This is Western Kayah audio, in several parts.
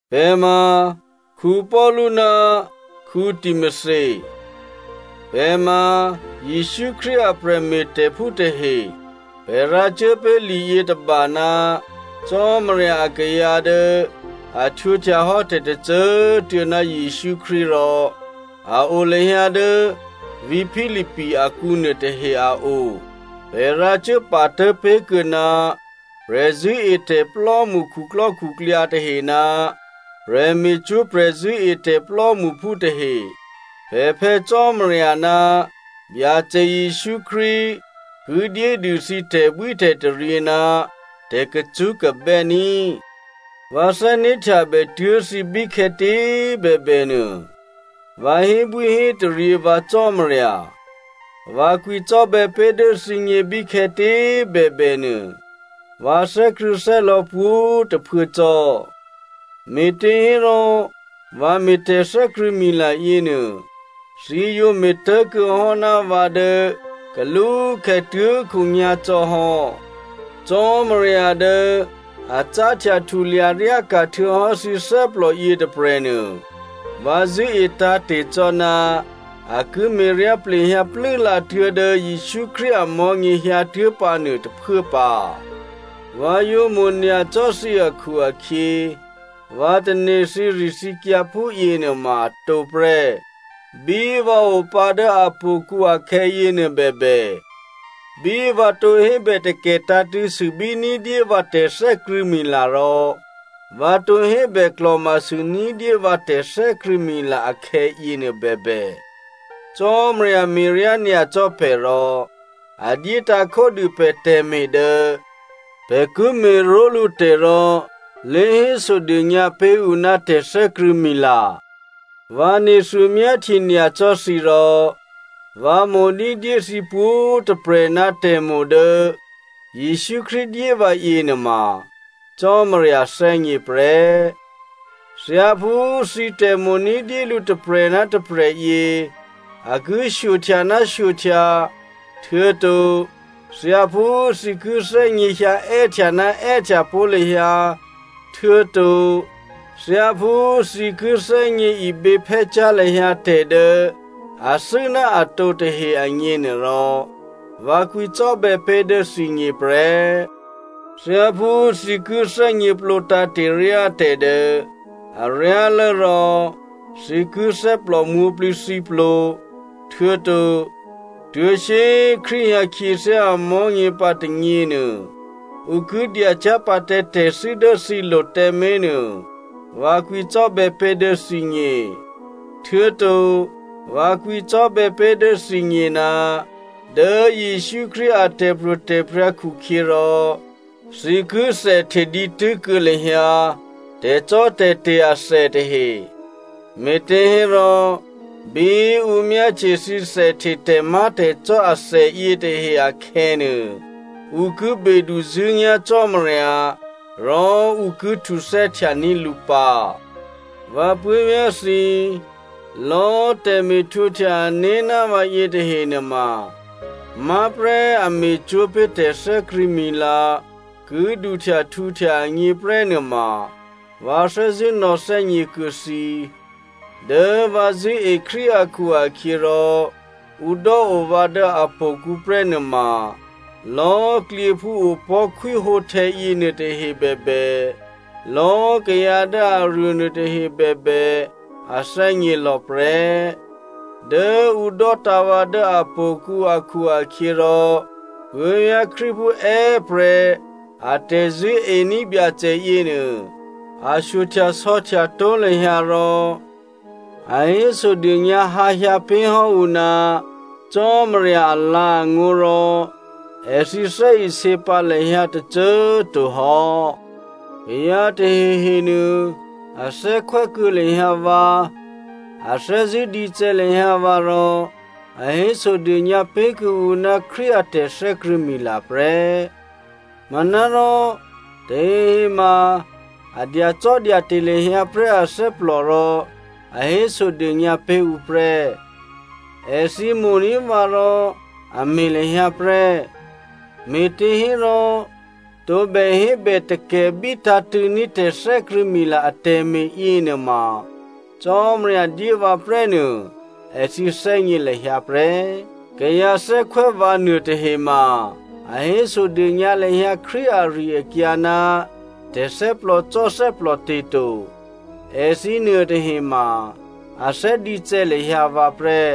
Pè̤ ma Paulu ná Timothy. Pè̤ ma Jesǔ Krístu a prè̤me̤tè̤phú tahe. Pè̤ rǎcuố pé̤ li yětôba ná Cò́marya akayǎ dố a htwǒhtya hò́ tè̤tôcô꤮ tuô̌ ná Jesǔ Krístu rò a o lahyǎ dố vǐ̤ Philippi akǔ nuôtahe a o. Pè̤ rǎcuốpatố̤ pé̤kuô̌ná prè̤zṳ̂́etè̤plò́mṳ khuklò́khuklyǎ tahe ná prè̤me̤cwó̤ prè̤zṳ̂́etè̤ plò́mṳphú tahe. Pè̤ Phè̌ Cò́marya ná Byacè Jesǔ Krístu ki dyédû thǐ tè̤bwítè̤taryě ná tè̤kacṳ́kabè́ ní꤮. Vǎ thè́né̤htyabè tuố̤ thǐ bíkhè̌tě꤮ bèbè nuô, vǎ hébwíhétaryě vǎ Cò́marya. Vǎ kwǐcò́bè̌ pé̤ dố thǐgně bíkhè̌tě꤮ bèbè nuô, vǎ thè́krṳ̂̌thè́lò̌ pwǒ̤꤮ tôphuố cò́. Me̤těhérò, vǎ me̤ tè̤thè́krṳ̂̌mila yěnuô, thǐ yǒ me̤tố̤kuô̌ hò́ ná vǎ dố kalúkhè̌ tuố̤khǒnyá̤ cò́ hò́. Cò́marya dố a cáhtya htulya ryáka̤ htuô̌hò́ thǐ thè́plò yětôprè̤nuô, vǎ zṳ̂́e tǎ̤te̤ cò́ ná a ki me̤ryá plehyǎ plû́lǎ tuố̤dố Jesǔ Krístu amò̤́nyě hyǎtuố̤ pǎnuô tôphuố pǎ. Vǎ yǒ mo̤ nyacò́ thǐ akhu-akhyě, vǎ tane̤ thǐrithǐkyǎ phúyěnuôma atǒ prè́. Bí vǎ opǎ dố htò̌kǔ akhè̌yěnuô bèbè, bí vǎ tǒ hébè takè̤ tǎ̤tṳ̂̌ sûbí ní̤dyé vǎ tè̤thè́krṳ̂̌mila rò vǎ tǒ hébè klò̤ma sû ní̤dyé vǎ tè̤thè́krṳ̂̌mila akhè̌yěnuô bèbè, Cò́marya me̤ryá nyacò́ pè̤ rò a dyétǎ̤ khódû pè̤ tè̤me̤ dố pè̤ ki me̤ró̤lǔ tè̤ rò lě hésodônyǎ pé̤ ǔ ná tè̤thè́krṳ̂̌mila. Vǎ nethuô myáhtye nyacò́ thǐ rò vǎ mo̤ ní̤dyé thǐ pwǒ̤꤮ tôprè̤ ná tè̤mo̤ dố Jesǔ Krístu dyé vǎ yěnuôma Cò́marya thè́gně prè́. Thyáphú thǐ tè̤mo̤ ní̤dyé lǔ tôprè̤ ná tôprè̤ yě, a ki shyohtya ná shyohtya, htuô̌to thyáphú thǐ ki thè́gněhyǎ è́htya ná è́htya pó̤ lahyǎ htuô̌to thyáphú thǐ ki thè́gně iběphè́cyá̤ lahyǎ tè̤ dố athû́ ná atǒ tahe agněnuôrò, vǎ kwǐcò́bè̌ pé̤ dố thǐgně prè́. Thyáphú thǐ ki thè́gněplǒ tǎ̤te̤ ryá tè̤ dố aryálố rò thǐ ki thè́plò mwǒ̤plǐthǐplo, htuô̌to tuố̤ shyé꤮ Krístu hyǎ khyěthyá amò̤́nyě pǎ tônyěnuô, ǔ ki dyacyá̤ pǎ tǎ tè̤thû́ dố thǐlo̤ tǎmé̤ nuô, vǎ kwǐcò́bè̌ pé̤ dố thǐgně. Htuô̌to vǎ kwǐcò́bè̌ pé̤ dố thǐgně, dố Jesǔ Krístu a tè̤pro̤tè̤prya̤ khukhyěrò, thǐ ki thèhte dǐtû́ kuô̌ lahyǎ tè̤cò́tè̤te̤ athè tahe. Me̤těhérò bí ǔ myáhtye thǐ thèhte tè̤má̤tè̤cò́ athè yětahe akhè̌nuô, ǔ ki beduzṳ̂́nyá̤ Cò́marya, rò ǔ ki htuthè́htyaní̤ lǔ pǎ. Vǎ puố̤vyá̤ thǐ, lò̌꤮ tè̤me̤htwǒhtya ané̤ ná vǎ yětahe nuôma má̤ prè́ a me̤cwó̤ pé̤ tè̤thè́krṳ̂̌mila ki duhtya htǔhtya agněprè́ nuôma vǎ thè́zṳ̂́ nò̌thè́gně kuô̌ thǐ. Dố vǎ zṳ̂́e Krístu akhu-akhyěrò ǔ dò́o vǎ dố htò̌kǔ prè́ nuôma lò̌꤮ klyěphú opò̤́ khwíhǒhtè̌ yěnuôtahe bèbè, lò̌꤮ kayǎ dố aruô nuôtahe bèbè, a thè́gně lò̌ prè́. Dố ǔ dò́tǎ̤ vǎ dố htò̌kǔ akhu-akhyěrò, puố̤vyá̤ Krístuphú è́prè̤ a tè̤zṳ̂́ení̤ Byacè yěnuô a shyohtyasò̌htya tó̤ lahyǎ rò a hésodônyǎ hǎ hyǎ pé̤ hò́ ǔ ná Cò́marya alǎ̤angó̤, rò èthǐ thè́isě pǎ lahyǎ tôcô꤮ to hò́. Kayǎ tahehenuô a thè́khwè́ kuô̌ lahyǎ vǎ, a thè́zṳ̂́ dícè̌ lahyǎ vǎ rò a hésodônyǎ pé̤kuô̌ǔ ná Krístu a tè̤thè́krṳ̂̌mila prè́. Manárò tahehe ma a dyacò́dyate̤ lahyǎ prè́ athè́plò rò a hésodônyǎ pé̤ ǔ prè́. Èthǐ mo̤ní̤ vǎ rò a me̤ lahyǎ prè́, me̤těhérò tǒbè hébètakè̤bí tǎ̤tṳ̂̌ní̤ tè̤thè́krṳ̂̌mila atè̤me̤ yěnuôma Cò́marya dyé vǎ prè́ nuô èthǐ thè́gně lahyǎ prè́. Kayǎ thè́khwè́ vǎ nuôtahe ma a hésodônyǎ lahyǎ Krístu ari-akyǎ ná tè̤thè́plòcò́ thè́plòte̤ to. Èthǐ nuôtahe ma a thè́ dícè̌ lahyǎ vǎ prè́.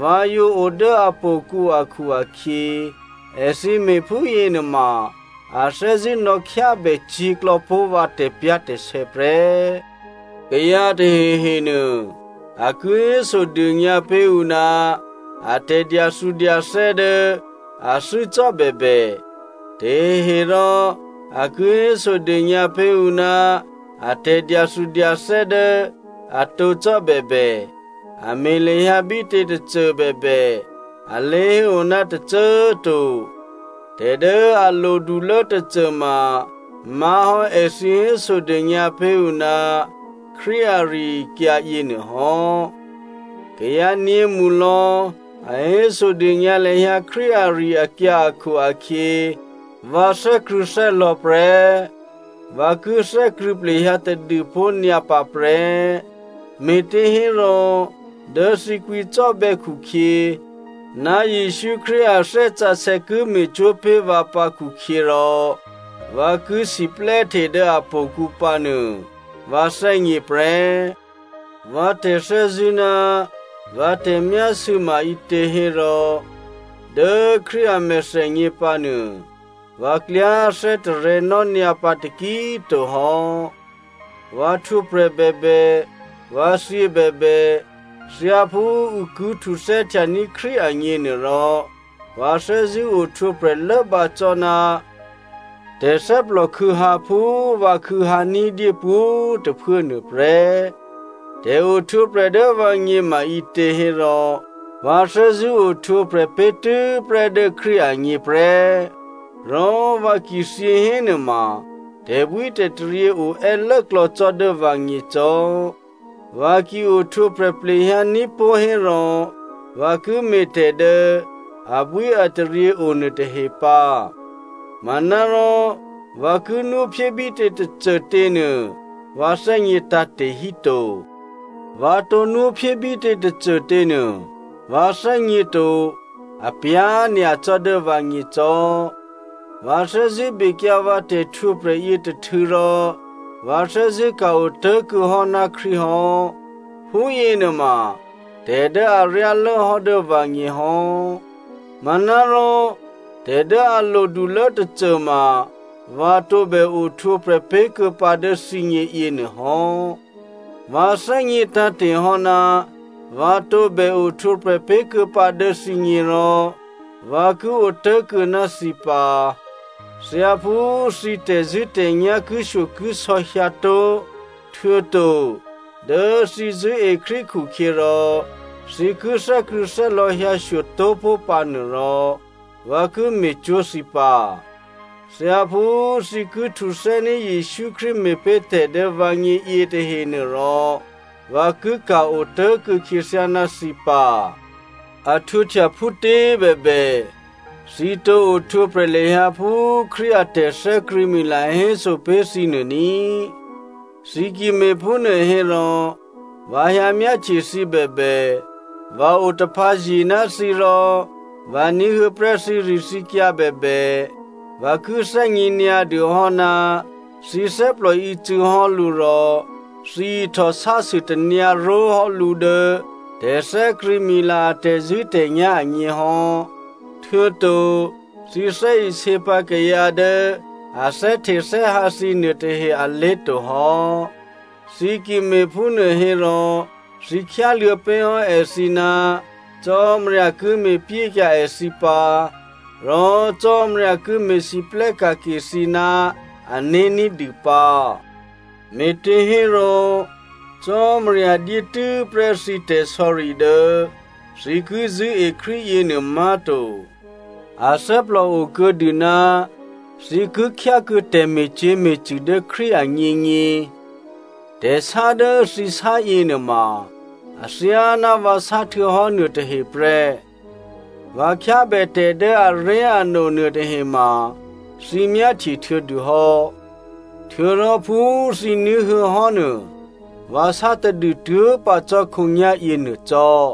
Vǎ yǒ o dố htò̌kǔ akhu-akhyě èthǐ me̤ phúyěnuôma a thè́zṳ̂́ nò̌khyábè cyě̤klò̌ pó̤ vǎ tè̤pyá̤tè̤sè̌ prè́. Kayǎ tahehenuô, a ki hésodônyǎ pé̤ ǔ ná a tè̤dyathudyathè́ dố athû́ cò́ bèbè, taheherò a ki hésodônyǎ pé̤ ǔ ná a tè̤dyathudyathè́ dố atǒ cò́bèbè, a me̤ lahyǎ bítě tôcô bèbè, a lé̤héo ná tôcô꤮ to. Tè̤ dố a lodulố tôcô ma má̤ hò́ èthǐ hésodônyǎ pé̤ ǔ ná Krístu ari-akyǎ yěnuôhò́. Kayǎ nyě̤mṳlò̌ a hésodônyǎ lahyǎ Krístu ari-akyǎ akhu-akhyě vǎ thè́krṳ̂̌thè́lò̌ prè́. Vǎ ki thè́krṳ̂̌ plehyǎ tadû pó̤nyǎ pǎ prè́, me̤těhérò, dố thǐ kwǐcò́bè̌ khukhyě, ná Jesǔ Krístu a Thè́ Sǎsè̌ ki me̤cwó̤ pé̤ vǎ pǎ khukhyěrò, vǎ ki siplè́hte dố htò̌kǔ pǎnuô vǎ thè́gně prè́. Vǎ tè̤thè́zṳ̂́ ná vǎ tè̤myásû̌ ma ǐtě hérò, dố Krístu a mèthènyě pǎnuô, vǎ klyá thè́tarè̤̌nò́ nyǎ pǎ taki꤮ to hò́. Vǎ htwǒprè̤ bèbè, vǎ thyě bèbè, thyáphú ǔ ki htuthè́htyaní̤ Krístu agněnuôrò, vǎ thè́zṳ̂́ ohtwǒprè̤ lốbǎ cò́ ná tè̤thè́plòkhû̌hǎ phú vǎ khû̌hyǎ ní̤dyé pwǒ̤꤮ tôphuố nuôprè́. Tè̤ohtwǒprè̤ dố vǎgně ma ǐtě hérò, vǎ thè́zṳ̂́ ohtwǒprè̤ pé̤tû́prè́ dố Krístu agně prè́, rò vǎ ki thyě hénuôma tè̤bwítè̤taryě oè́ lốklò̌ cò́ dố vǎgně cò́. Vǎ ki ohtwǒprè̤ plehyǎní̤pó̤ hérò, vǎ ki me̤ tè̤ dố abwíataryě o nuôtahe pǎ. Manárò vǎ ki nwóphyé bítě tôcôtě nuô vǎ thè́gně tǎ̤te̤ hí to. Vǎ tǒ nwóphyé bítě tôcôtě nuô vǎ thè́gně to, apyá̤ nyacò́ dố vǎgně cò́. Vǎ thè́zṳ̂́ bekyǎ vǎ tè̤htwǒprè̤ yětôhtû̌ rò vǎ thè́zṳ̂́ ka̤-o tố̤kuô̌ hò́ ná Krístu hò́, phúyěnuôma tè̤dố aryálốhò́ dố vǎgně hò́. Manárò, tè̤ dố a lodulố tôcôma vǎ tǒbè ohtwǒprè̤ pé̤ kuô̌pǎ dố thǐgně yěnuôhò́. Vǎ thè́gně tǎ̤te̤ hò́ ná vǎ tǒbè ohtwǒprè̤ pé̤ kuô̌pǎ dố thǐgně rò vǎ ki otố̤kuô̌ ná thǐ pǎ. Thyáphú thǐ tè̤zṳ̂́tè̤nyá̤ kishyokisò̌ hyǎtó̤, htuô̌to dố thǐ zṳ̂́e Krístu khukhyěrò thǐ ki thè́krṳ̂̌thè́lò̌ hyǎshyo tó̤pó̤ pǎ nuôrò vǎ ki me̤cwó̤ thǐ pǎ. Thyáphú thǐ ki htuthè́ní̤ Jesǔ Krístu me̤pé̤ tè̤dố vǎgně yětahenuôrò vǎ ki ka̤ otố̤kuô̌ khyěthyá ná thǐ pǎ. A htwǒhtya phútě bèbè, thǐ tǒ ohtwǒprè̤ lahyǎ phú Krístu a tè̤thè́krṳ̂̌mila héso pé̤ thǐnuô ní꤮. Thǐ ki me̤phúnuô hérò vǎ hyǎmyáhtye thǐ bèbè, vǎ otaphǎzye ná thǐ rò vǎ ní̤huô̌ prè́ thǐrithǐkyǎ bèbè, vǎ ki thè́gně nyǎdûhò́ ná thǐ thè́plò ícû̌hò́ lǔ rò thǐ ihtòsásû tanyǎró̤hò́ lǔ dố tè̤thè́krṳ̂̌mila a tè̤zṳ̂́tè̤nyá̤ agněhò́, htuô̌to thǐ thè́isě pǎ kayǎ dố a thè́htethè́hǎ thǐ nuôtahe alé̤ tohò́. Thǐ ki me̤phúnuô hérò thǐ khyáluô̌ pé̤hò́ èthǐ ná Cò́marya ki me̤pyékyǎ èthǐ pǎ, rò Cò́marya ki me̤lwóhteka̤ ke thǐ ná ané̤ ní̤dû pǎ. Me̤těhérò, Cò́marya dyé tû́prè́ thǐ tè̤sò̌ri dố thǐ ki zṳ̂́e Krístu yěnuô má̤to, a thè́plòo kuô̌dû ná thǐ ki khyákuô̌ tè̤me̤cyě̤me̤cṳ̂ dố Krístu agněgně. Tè̤sá dố thǐ sá yěnuôma athyáná vǎ sá htuô̌hò́ nuôtahe prè́. Vǎ khyábè tè̤ dố aré̤ano nuôtahema thǐ myáhtye htuô̌dû hò́. Htuô̌rò phú thǐ ní̤huô̌ hò́ nuô, vǎ sá tadû tuố̤ pǎ cò́ khǒnyá̤yěnuô cò́.